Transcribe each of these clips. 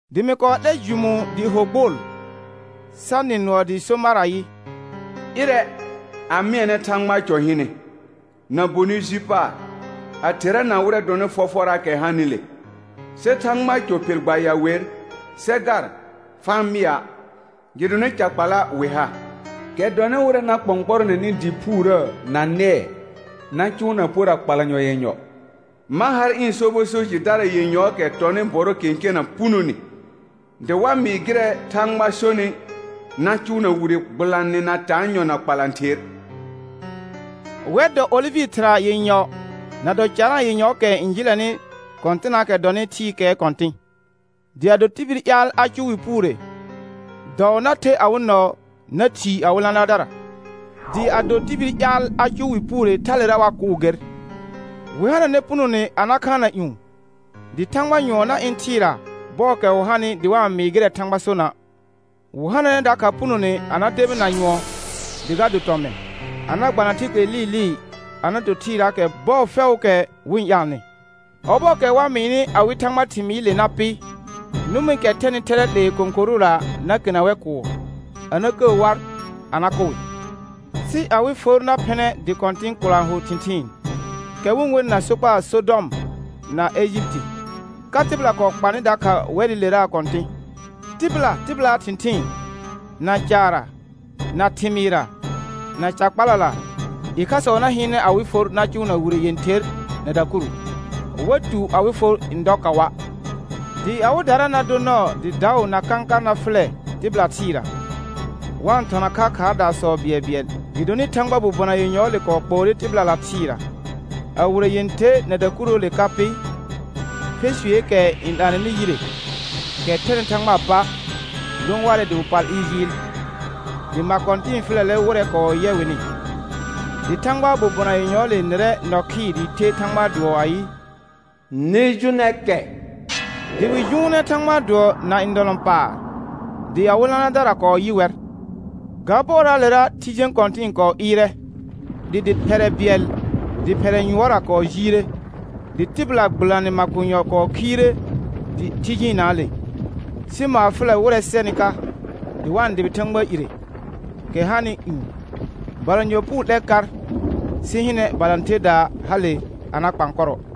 Dɩ mɩ kɔɔ 'lɛr jʋmũu dɩɩ ho gbʋʋl, sa nɩ nʋɔ dɩɩ so mar ayɩ: Ɩrɛ, a mɩɛnɛ Thãgbaa cɔ hɩnɛ, na bonɩ ji paar, a therana wɩrɛ dɔnɩ fɔfɔraakɛ hanɩle. Sɩ Thãgbaa cɔ phel gbaya wer, sɛ gar, fa-n mɩa', gɩdonɩ ca kpala wɩ ha, kɛ dɔnɩ wɩrɛ na kpɔ̃kpɔrɔnɛnɩ dɩ phuurə na nɛɛ na cʋʋna pora kpalanyɔ yenyɔ. Ma har ɩ̃ sobɔ so jɩdara yenyɔɔkɛ tɔnɩ bɔrɔ kẽkena punone, dɩ wa mɩɩ gɩrɛ Thãgba sonɩ na cʋʋna wire gbɩlanɩ na taanyɔ na kpalãther. Wɛr dɔ olɩvɩ thɩra yenyɔ na dɔ carãa yenyɔ kɛ n jɩlɛnɩ Kɔ̃tɩnnaakɛ dɔnɩ thɩɩkɛɛ Kɔ̃tɩ̃. Dɩ ado tibil ƴaal a cʋʋ wɩ puure, dɔɔ na ther awɩ nɔɔ na thii awɩ lãlaardara; dɩ ado tibil ƴaal a cʋʋ wɩ puure thalera wa kʋʋ ger. Wɩ hananɛ punone a na khaanna ƴũ, dɩ thãgba nyʋɔn na ɩ̃ thɩɩra bɔɔkɛ wɩ hanɩ dɩ wa-n mɩɩ gɩrɛ Thãgba sona'. Wɩ hananɛ dakha punone a na debina nyʋɔn dɩ ga do tɔmɩn, a na gbana thɩlke lɩɩlɩɩ a na to thɩɩraakɛ bɔɔ fɛʋʋkɛ wɩ-n ƴaalnɩ. Ɔbɔɔkɛ wa mɩɩnɩ awɩ Thãgba thɩmɩɩle na pɩ, nʋmɩkɛ thɛnɩ thɛrɛ 'lee kõkorʋra na kena wɛr kʋʋr, a na kəə war, a na kʋ wɩ. Sɩ awɩ for na phɩnɛ dɩ kɔ̃tɩ̃ kʋlã hʋ thɩ̃thɩɩn, kɛ wɩ-n wenɩ na sokpaa Sɔdɔm na Ejipiti, ka tɩbɩla kɔɔ kpanɩ dakha wɛrɩleraa Kɔ̃tɩ̃. Tɩbɩla tɩbɩlaa thɩ̃thɩɩn, na caarra, na thɩmɩɩrra, na ca kpalala, ɩkhasɔ na hɩɩnɛ awɩ for na cʋʋna wire yẽther na dakuru, wa tu awɩ for n dɔ kaʋa'. Dɩ awɩdara na dor nɔɔ dɩ daʋ na kãkar na fʋlɛ tɩbɩla thɩɩra, wa-n thɔna kha khaardaasɔ bɩɛlbɩɛl, gɩdonɩ Thãgbaa bobona yenyɔɔle kɔɔ kpoore tɩbɩlala thɩɩra. A wire yẽther na dakuruule ka pɩ, fesueeke n 'laanɛnɩ yire, kɛ thɛnɩ Thãgbaa pa, lõ warɛ dɩ wɩ pal ɩɩr jɩɩl, dɩ ma kɔ̃tɩ̃ɩ fʋlɛlɛ wɩrɛ kɔɔ yɛ wɩnɩ. Dɩ Thãgbaa bobona yenyɔɔle nɩrɛ nɔ khɩɩr dɩɩ the Thãgbaa dʋɔ ayɩ: Nɩ jʋnɛ kɛ. Dɩ wɩ jʋʋnɛ Thãgbaa dʋɔ na ndɔlɔ̃paar, dɩ awɩ lãlaardara kɔɔ yɩ wɛr. Ga bɔɔraalera thɩ jẽ kɔ̃tɩ̃ɩ kɔɔ ɩɩrɛ, dɩ dɩ phɛrɛ bɩɛl dɩ phɛrɛ yʋɔrra kɔɔ jiire, dɩ tɩbɩla gbɩlanɩ makonyɔ kɔɔ khiire thɩ jɩɩnnaale, sɩ maar fʋlɛ wɩrɛ sɛnɩ ka, dɩ wa-n dʋbɩ Thãgba ire, kɛ hanɩ ƴũ. Balanyɔ puu 'lɛr kar, sɩ hɩnɛ, balãtherdaa hale a na kpaan kɔrɔ.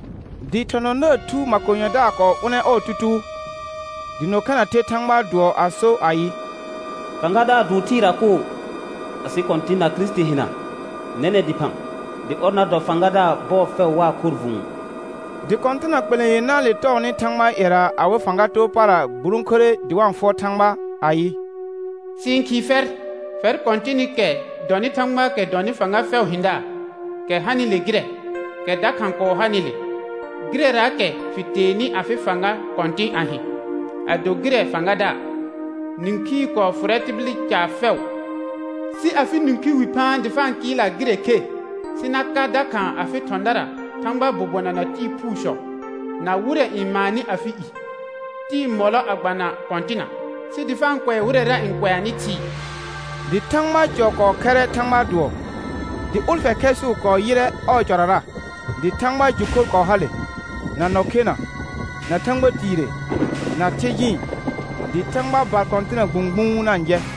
Dɩ thɔ̃thɔ̃daar thu makonyɔdaar kɔɔ ʋnɛ ɔɔ tutuu, dɩ nɔ khena the Thãgbaa dʋɔ a so ayɩ: Fãgadaar dʋʋr thɩɩra koo, asɩ Kɔ̃tɩ̃ na ɔɔ Kirisiti hɩna nɛnɛ̃ dɩphã, dɩ ɔr na dɔ Fãgadaar bɔɔ fɛʋ waa khorr vʋ̃ʋ. Dɩ kɔ̃tɩna kpelẽ yenãale tɔɔnɩ Thãgbaa ƴɛra awɩ fãga too para gburõkure dɩ wa-n fʋɔr Thãgba, ayɩ: Sɩ-n khɩɩ fɛr, fɛr Kɔ̃tɩnɩkɛ dɔnɩ Thãgbaakɛ dɔnɩ fãga fɛʋʋ hɩ̃daar, kɛ hanɩle gɩrɛ, kɛ dakha kɔɔ hanɩle, gɩrɛraakɛ fɩ teenɩ afɩ fãga kɔ̃tɩ̃ a hɩ̃, a do gɩrɛ Fãgadaar. Nĩkhii kɔɔ fʋrɛ tibil caar fɛʋ, sɩ afɩ nĩkhi wi phaan dɩ fa kɩɩlna gɩrɛ khe, sɩ na ka dakha afɩ thɔ̃dara Thãgbaa bobona na tɩɩ phuusɔ, na wɩrɛ n maannɩ afɩ i, tɩɩ mɔlɔ a gbana kɔ̃tɩna, sɩ dɩ fa-n kʋɛ wɩrɛra n kʋɛanɩ thɩɩ. Dɩ Thãgbaa cɔ kɔɔ khɛrrɛ Thãgbaa dʋɔ, dɩ ʋlfɛ khɛɛsʋʋ kɔɔ yɩrrɛ ɔɔ cɔrara, dɩ thãgba jʋ khor kɔɔ hale, na nɔ khena, na thãgba tiire, na thɩ jɩɩn, dɩ thãgba bar kɔ̃tɩna gbũgbũu na-n jɛ.